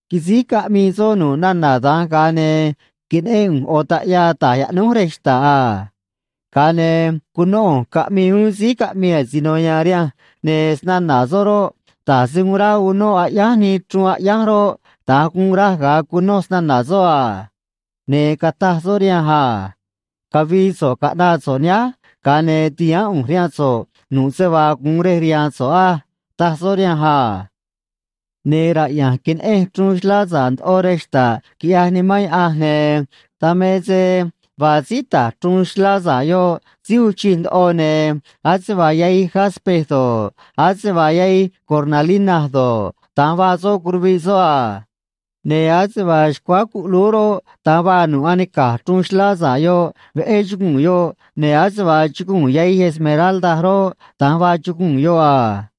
Quisíj caꞌmii soꞌ nu̱ꞌ nana̱ dan, ga̱a ne̱ queneꞌén ꞌu̱nj ꞌo̱ taꞌyaa ta̱j yaꞌnúj rej xta̱ꞌ a. Ga̱a ne̱ cunó ꞌu̱nj caꞌmii uún síí caꞌmii asino ya̱a̱n rihanj, ne̱ snana̱ soꞌ roꞌ, da̱j se uun ráꞌ unóꞌ aꞌyánj nii chruun aꞌyánj roꞌ, da̱nj guun raj ga̱a cunoj snana̱ soꞌ a. Ne̱ cataj soꞌ rihanj a: ―Cavi̱i̱ so̱ꞌ caꞌna̱ꞌ so̱ꞌ nihánj, ga̱a ne̱ ti̱haán ꞌu̱nj rihaan so̱ꞌ nu̱ꞌ se vaa gu̱un rej rihaan so̱ꞌ á ―taj soꞌ rihanj a. Ne̱ raꞌya̱nj queneꞌenj chruun xlá sa̱ꞌ ndoꞌo rej xta̱ꞌ, quiꞌyaj Nimán Yaꞌanj, ne̱ dan me se vaa síí ta̱j chruun xlá sa̱ꞌ yoꞌ síí uun chij ndoꞌo, ne̱ ase vaa yahij “jaspe” do̱ꞌ, ase vaa yahij “cornalina” do̱ꞌ, da̱nj vaa soꞌ curuviꞌ soꞌ a. Ne̱ ase vaa xcuáá cuꞌlúú roꞌ, da̱nj vaa nu̱ꞌ anica̱j chruun xlá sa̱ꞌ yoꞌ, veꞌé chuguu̱n yoꞌ, ne̱ ase vaa chuguu̱n yahij “esmeralda” roꞌ, da̱nj vaa chuguu̱n yoꞌ a.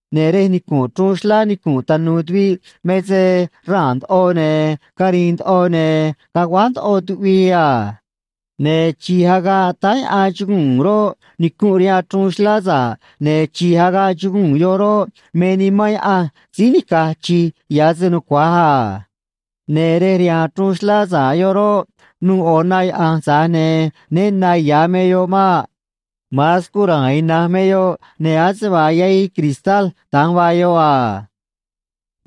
Ne̱ rej nicu̱nꞌ chruun xlá nicu̱nꞌ tanu̱u̱ tuviꞌ me se raa̱n ndoꞌo, ne̱ cari̱i̱n ndoꞌo, ne̱ caguáj ndoꞌo tuꞌvii a. Ne̱ chi̱j agaꞌ táá yaꞌan chuguu̱n roꞌ, nicunꞌ rihaan chruun xlá sa̱ꞌ, ne̱ chi̱j agaꞌ chuguu̱n yoꞌ roꞌ, me Nimán Yaꞌanj síí nica̱j chi̱j ya̱ se nucua̱j a. Ne̱ rej rihaan chruun xlá sa̱ꞌ yoꞌ roꞌ, nu̱u̱ ꞌo̱ na yaꞌa̱nj, tza̱j ne̱ né na ya̱ me yoꞌ maꞌ. Ma̱an scura̱a̱n ina̱nj me yoꞌ, ne̱ ase vaa yahij cristal da̱nj vaa yoꞌ a.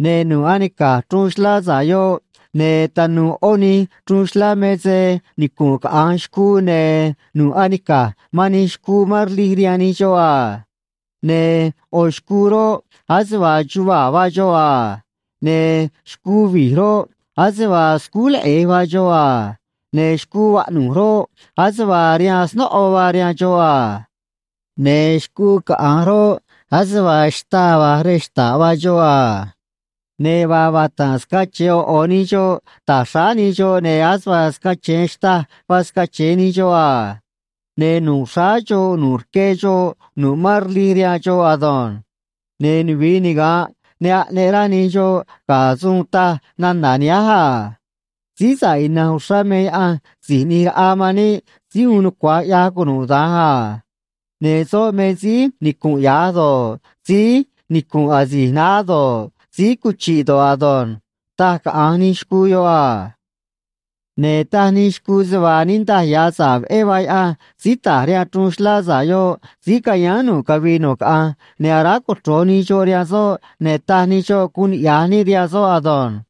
Ne̱ nu̱ꞌ anica̱j chruun xlá sa̱ꞌ yoꞌ ne̱ tanu̱u̱ ꞌó nij chruun xlá me se nicunꞌ caꞌa̱nj xcuu, ne̱ nu̱ꞌ anica̱j man nij xcuu mán rlij rihaan nij xoꞌ a. Ne̱ ꞌo̱ xcuu roꞌ, ase vaa chuvaa̱ vaa xoꞌ a. Ne̱ xcuu vi̱j roꞌ, ase vaa scúj leꞌe̱j vaa xoꞌ a. Ne̱ xcuu vaꞌnu̱j roꞌ, ase vaa rihaan snóꞌo vaa rihaan xoꞌ a. Ne̱ xcuu caꞌa̱nj roꞌ, ase vaa xtaa va̱j rej xta̱ꞌ vaa xoꞌ a. Ne̱ vaa vata̱nꞌ scache̱e ꞌo̱ ꞌo̱ nij xoꞌ ta̱j xráá nij xoꞌ, ne̱ ase vaa scache̱e xtâj vaa scache̱e nij xoꞌ a. Ne̱ nu̱ꞌ xráá xoꞌ nu̱ꞌ rque xoꞌ nu̱ꞌ mán rlij rihaan xoꞌ ado̱nj. Ne̱ nuvi̱i niga̱nꞌ ne aꞌneꞌ rá nij xoꞌ ga̱ suun taj nana̱ nihánj a: Síí sa̱ꞌ ina̱nj uxrá me Yaꞌanj Si̱j ꞌNi̱j Raꞌa man níꞌ Síí Uun Nucua̱j ꞌYaj Cunuda̱nj a. Ne̱ soꞌ me síí nicu̱nꞌ ya̱j do̱ꞌ, síí nicu̱nꞌ asi̱j naá do̱ꞌ, síí cuchi̱ꞌ do̱ꞌ ado̱nj, taj caꞌa̱nj nij xcuu yoꞌ a. Ne̱ taj nij xcuu se vaa niꞌndaj ya̱ sa̱ꞌ veꞌé vaa Yaꞌanj síí ta̱j rihaan chruun xlá sa̱ꞌ yoꞌ síí ca̱yáán nu̱ꞌ cavii nu̱ꞌ caꞌanj, ne̱ aráj cochro̱j nij xoꞌ rihaan soꞌ, ne̱ taj nij xoꞌ guun niꞌya̱j níꞌ rihaan soꞌ ado̱nj.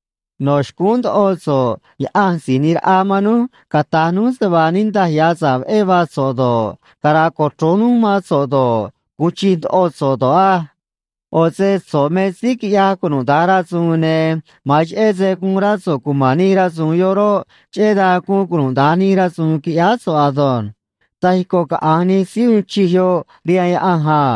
No̱ xcúún ndoꞌo so̱ꞌ Yaꞌa̱nj Si̱j ꞌNi̱j Raꞌa man núj cata̱j núj se vaa niꞌndaj ya̱ sa̱ꞌ veꞌé vaa so̱ꞌ do̱ꞌ, cara̱a̱ cochro̱j núj mán so̱ꞌ do̱ꞌ, gu̱un chij ndoꞌo so̱ꞌ do̱ꞌ á. ꞌO̱ se so̱ꞌ me síí quiꞌyaj cunuda̱nj rasu̱u̱n, ne̱ ma̱an cheꞌé se guun rá so̱ꞌ cuma̱n nij rasu̱u̱n yoꞌ roꞌ, cheꞌé dan guun cunuda̱nj nij rasu̱u̱n, quiꞌyáá so̱ꞌ ado̱nj taj ico̱ caꞌa̱nj nij síí uun chij yoꞌ rihaan Yaꞌanj a.